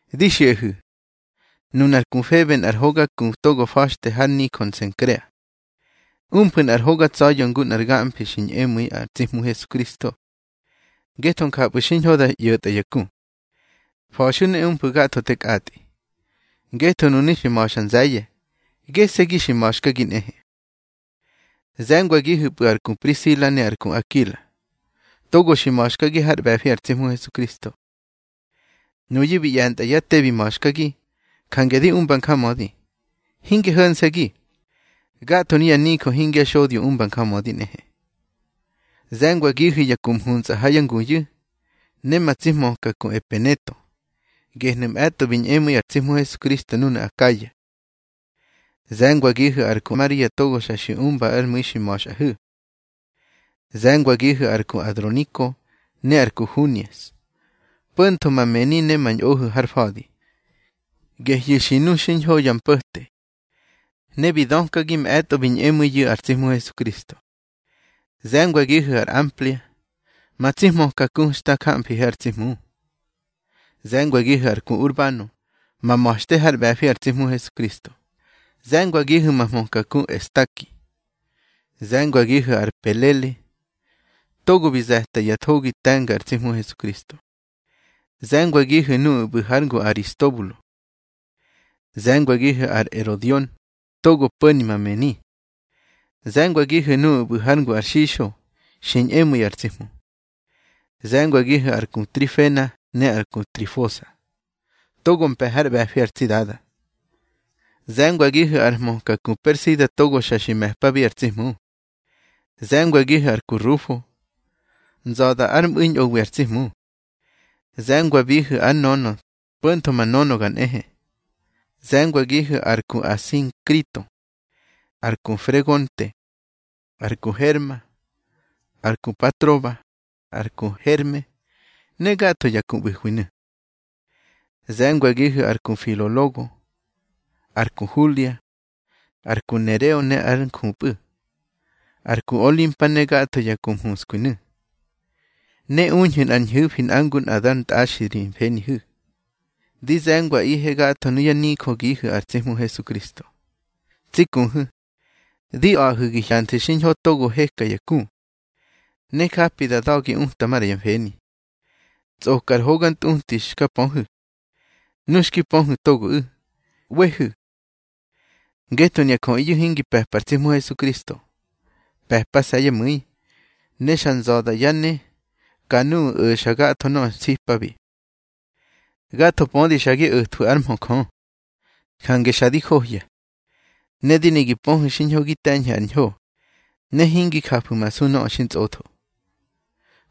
Di xiꞌahu̱, nunar ku Febe nꞌar hoga ku togo fa̱xte har nijö Nsenkrea. Umfu̱ nꞌar hoga tsa̱ya̱ ngu nꞌar gamfi xi ñꞌemu̱i ar tsi Hmu Hesukristo, ngetho njapꞌu̱ xiñho da ꞌyo̱tꞌa ya ku. Fa̱xu̱ ne umfu̱ gatho te kꞌatꞌi, ngetho nunu̱ xi ma̱xa nze̱ye̱. Gese̱gi xi ma̱xkagi nꞌehe. Ze̱ngwagihu̱pꞌu̱ ar ku Prisila ne ar ku Akila, togo xi ma̱xkagi hár ꞌbe̱fi ar tsi Hmu Hesukristo. Nuyu̱ bi ꞌye̱ntꞌa yá te bi ma̱xkagi, jange di umba njamödi. Hinge ho̱nse̱gi, gatho nuya nijö hingya xodyo umba njamödi nꞌehe. Ze̱ngwagihu̱ ya ku mhuntsꞌa ha yá nguyu̱, ne ma tsi hmöka ku Epeneto. Gehnu̱ mꞌe̱tꞌo bi ñꞌemu̱i ar tsi Hmu Hesukristo núnu̱ Akaya. Ze̱ngwagihu̱ ar ku Maria togo xa xi umba ár mu̱i xi ma̱xꞌahu̱. Ze̱ngwagihu̱ ar ku Androniko ne ar ku Hunias, po̱ntho ma mëni ne ma ñꞌohu̱ har fa̱di. Gehyu̱ xi nu xiñho ya mpo̱te, ne bi dökagi mꞌe̱tꞌo bi ñꞌemu̱iyu̱ ar tsi Hmu Hesukristo. Ze̱ngwagihu̱ ar Amplia, ma tsi hmöka ku xta jamfihe ar tsi Hmu. Ze̱ngwagihu̱ ar ku Urbano ma ma̱xte hár ꞌbe̱fi ar tsi Hmu Hesukristo, ne ze̱ngwagihu̱ ma hmöka ku Estaki. Ze̱ngwagihu̱ ar Apele togo bi ze̱ta ya thogi te̱nga ar tsi Hmu Hesukristo. Ze̱ngwagihu̱ nuꞌu̱ ꞌbu̱ hár ngu ar Aristobulo. Ze̱ngwagihu̱ ar Erodion togo po̱ni ma mëni. Ze̱ngwagihu̱ nuꞌu̱ ꞌbu̱ hár ngu ar Xixo xi ñꞌemu̱i ar tsi Hmu. Ze̱ngwagihu̱ ar ku Trifena ne ar ku Trifosa, togo mpe̱ hár ꞌbe̱fi ar tsi Dada. Ze̱ngwagihu̱ ar hmöka ku Persida togo xa xi me̱pabi ar tsi Hmu. Ze̱ngwagihu̱ ar ku Rufo, nza̱da ár mꞌu̱i ñꞌowi ar tsi Hmu. Ze̱ngwabihu̱ ár nönö, po̱ntho ma nönöga nꞌehe. Ze̱ngwagihu̱ ar ku Asinkrito, ar ku Fregonte, ar ku Herma, ar ku Patroba, ar ku Herme ne gatho ya ku ꞌbu̱hwinu̱. Ze̱ngwagihu̱ ar ku Filologo, ar ku Hulia, ar ku Nereo ne ár njupꞌu̱, ar ku Olimpa ne gatho ya ku mhuskwinu̱. Ne uñhu̱ nꞌar ñhu̱fi nꞌa ngu nꞌa dar ntꞌaxi ri mfenihu̱. Di ze̱ngwaꞌihe gatho nuyá nijögihu̱ ar tsi Hmu Hesukristo. Tsi kuhu̱, di a̱ꞌahu̱ gi hyanthu̱ xiñho togo heka ya ku, ne japi da da̱gi uta maꞌra ya mfeni, tsꞌoka ar hoga ntꞌuti xka pöhu̱. Nu xki pöhu̱ togoꞌu̱, ꞌwehu̱. Ngetho nuya jöꞌiyu̱ hingi pe̱pa ar tsi Hmu Hesukristo. Pe̱pase̱ yá mu̱i, ne xa nza̱da yá ne ka nuꞌu̱ o̱xa gatho nöꞌö nsipabi. Gatho pödi xa gi o̱thwu̱ ár mhö Jö, jange xa di johya. Ne di ne gi pöhu̱ xiñho gi te̱ñhu̱ ar ñho, ne hingi jafu̱masu nöꞌö xintsꞌotho.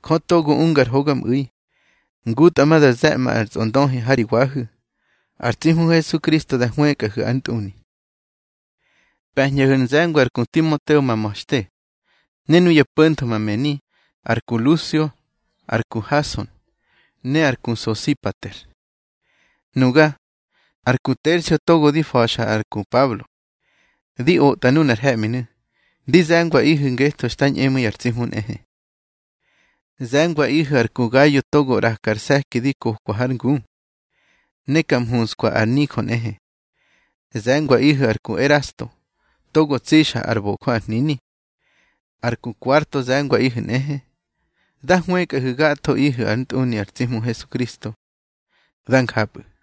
Jö togo unga ar hogamꞌu̱i, ngutꞌa ma da ze̱ꞌma ar tsꞌondöhi ha ri wahu̱. Ar tsi Hmu Hesukristo da hwëkꞌahu̱ ár ntꞌuni. Pe̱ñꞌaꞌihu̱ ar nze̱ngwa ar ku Timoteo ma ma̱xte, ne nuya po̱ntho ma mëni, ar ku Lusio, ar ku Hason, ne ar ku Sosipater. Nuga, ar ku Tersio togo di fa̱xa ar ku Pablo, di otꞌa nunar he̱ꞌminu̱, di ze̱ngwaꞌihu̱ ngetho xta ñꞌemu̱i ar tsi Hmu nꞌehe. Ze̱ngwaꞌihu̱ ar ku Gayo togo ꞌraka ar se̱ki di kokwa hár ngu, ne ka mhunskwa ar nijö nꞌehe. Ze̱ngwaꞌihu̱ ar ku Erasto togo tsixa ár bojö ar hnini. Ar ku Kuarto ze̱ngwaꞌihu̱ nꞌehe. Dá hwëkꞌahu̱ gathoꞌihu̱ ár ntꞌuni ar tsi Hmu Hesukristo. Dá njapꞌu̱.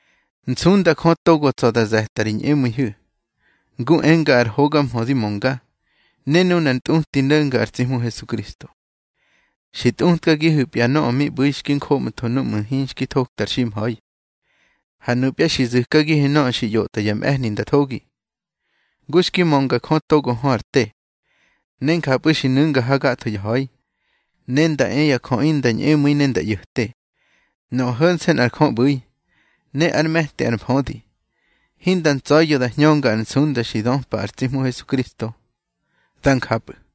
Nsunda Jö togo tsa̱ da ze̱ta ri ñꞌemu̱ihu̱, ngu enga ar hoga mhö di mönga, ne nunar ntꞌuti no̱nga ar tsi Hmu Hesukristo. Xi tꞌutkagihu̱pya nöꞌö mi ꞌbu̱i xki joꞌmtho núꞌmu̱ hinxki thokta ar ximha̱i. Ha nupya xi zu̱kagihu̱ nöꞌö xi ꞌyotꞌa ya mꞌe̱hni nda thogi, ngu xki mönga Jö togo hö ar te. Ne njapꞌu̱ xi nu̱nga ha gatho ya ha̱i, ne nda e ya jöꞌi nda ñꞌemu̱i ne nda ꞌyo̱te. Nöꞌö ho̱nse̱ nꞌa Jö ꞌbu̱i, ne ár me̱ti ar mfödi. Hinda ntsa̱ya̱ da hñönga ar nsunda xi döpa ar tsi Hmu Hesukristo. Dá njapꞌu̱.